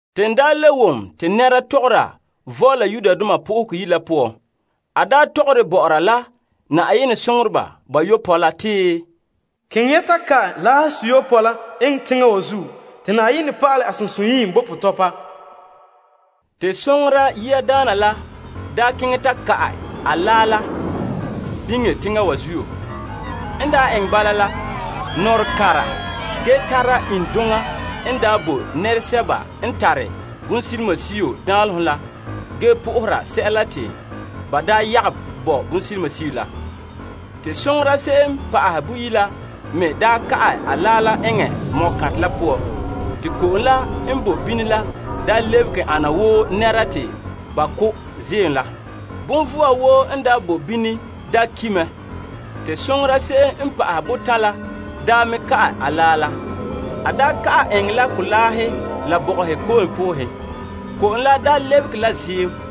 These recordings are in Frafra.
Te n le wom konkore n voole Yenɛ Yire la poan, tɔgɔre bɔ'ɔra la Yenɛ soŋoreba bayopɔe la te, Keŋɛ ya ta ka'ɛ laahe seyopɔe la eŋɛ teŋa wa zuo te Yenɛ pa'alɛ a sunsunyiim bo potɔpa la. Te soŋora yiadaana la keŋɛ ta ka'ɛ a laa la biŋe teŋa wa zuo. N eŋɛ bala la, nɔrɔkanra ge tara iŋduŋa n daa bo nɛresɛba n tare bonsilimasio danlehom la ge na'aha sɛla la te ba yagom bo bonsilimasio la. Te soŋora se'em pa'ahɛ boyi' la me ka'ɛ a laa la eŋɛ ko'kantɛ la poan. Te ko'om la n bo bini la lebehe ana wo nɛra n ki' ziim la. Bonvɔa woo n boe bini ki' mɛ. Te soŋora se'em n pa'ahɛ botan' la me ka'ɛ a laa la. A ka'ɛ eŋɛ la kolaahe la bɔgɔhe ko'om poohen. Ko'om la lebehe la ziim.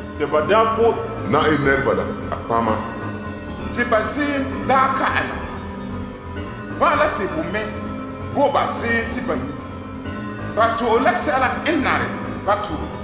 Te ba ko' Yenɛ nɛreba la a nɔtɔgɔheba te ba ziim daa ka'ɛ na. Bala te ho me bo ba ziim te ba nyu'. Ba to'e la sɛla n nare ba to'e.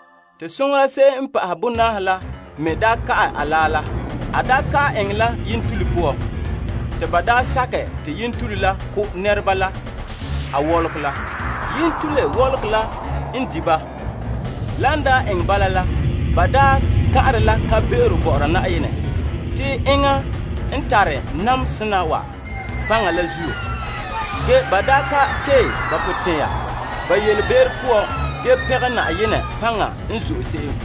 Te soŋora se'em n pa'ahɛ bonaahe la me ka'ɛ a laa la. A ka'ɛ eŋɛ la yentule te yentule ko' nɛreba la wɔlɔgɔ. Yentule wɔlɔgɔ la n di' ba, te ba kan'are la kan'be'ero bɔ'ɔra Yenɛ n tare namehe kona wa paŋa. Ge ba ka tee ba potɛn'ɛra ba yelebe'ero poan ge pɛngɛ Na'ayenɛ paŋa n zo'e se'em.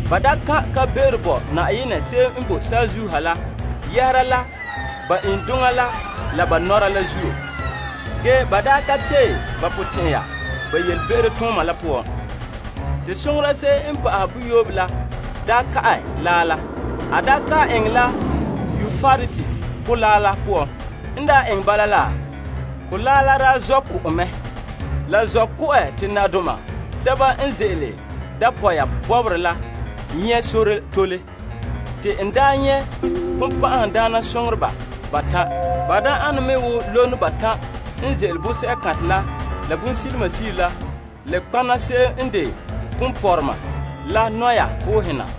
Ba kan' kan'be'ero bo Yenɛ se'em n boe saazuo ha la yɛhera la ba iŋduŋa la la ba nɔra la zuo. Ge ba ka tee ba potɛn'ɛra ba yelebe'ero tooma la poan. Te soŋora se'em n pa'ahɛ boyoobe la daa ka'ɛ laa la. A ka'ɛ eŋɛ la Euprates Kolaa la poan. N eŋɛ bala la, kolaa la zɔ' ku'ɛ mɛ. La zɔ' ku'ɛ te nadoma sɛba n ze'ele dapɔya bɔbɔre la nyɛ' sore tole. Te n nyɛ' bonbɛ'ɛhe batan' ane wo lono batan' n ze'ele bonsɛ'kantɛ la bonsilimasio la nɔtɔgɔha ponpɔrɔma la nɔyan na.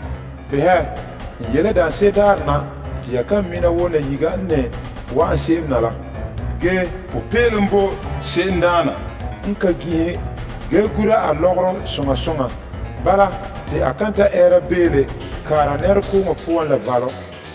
Behɛ, mam ye' mɛ na wo nayiga la. Ge popeelom bo se'emdaana n ka ginhe ge gura a lɔgɔrɔ soŋa soŋa. Bala, te a kan ta ɛɛra beele nɛrekooŋɔ poan la valom!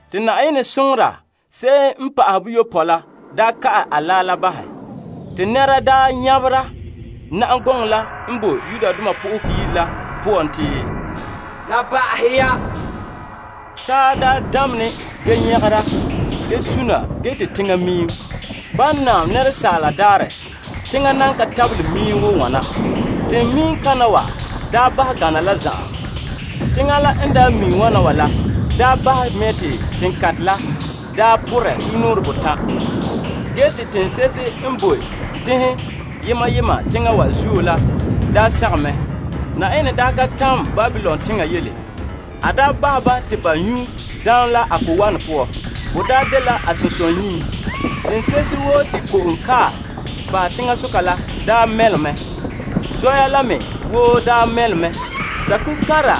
Te Yenɛ soŋora se'em n pa'ahɛ boyopɔe la ka'ɛ a laa la bahɛ. Te konkore nyabera na'am gɔŋɔ la n boe Yenɛ Yire la poan te, La ba'ahɛ ya. Saa damene ge nyagera, ge suna, te teŋa miim. Ban naam asaala daarɛ, teŋa nan ka tabelɛ miim wo wana. Teŋa miim kana wa ba gana la zan'an. Teŋa la n daa miim wana wa la bahɛ mɛ te teŋkantɛ la buuri sugumnɔɔren botan'. Ge te teŋse'ehe n boe teŋhe yema yema teŋa wa zuo la sagom mɛ. Yenɛ ka tamɛ Babilon teŋa yele. A bahɛ ba te ba nyu' daam la a ko'wanɛ poan. Bo dela a sunsunyiim. Teŋse'ehe woo te ko'om kae bahɛ teŋasoka la mɛlom mɛ. Zɔya la me woo mɛlom mɛ. Saakuga kanra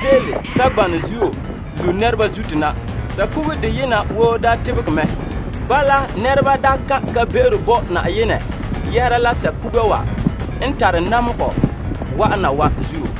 ze'ele saŋgbanɛ zuo lu' nɛreba zuto na. Saakuga deyena woo tebegɛ mɛ wo ki botɛre la. Bala, nɛreba kan' kan'be'ero bo Yenɛ yɛhera la saakuga wa n tare namehegɔ wa'ana wa zuo.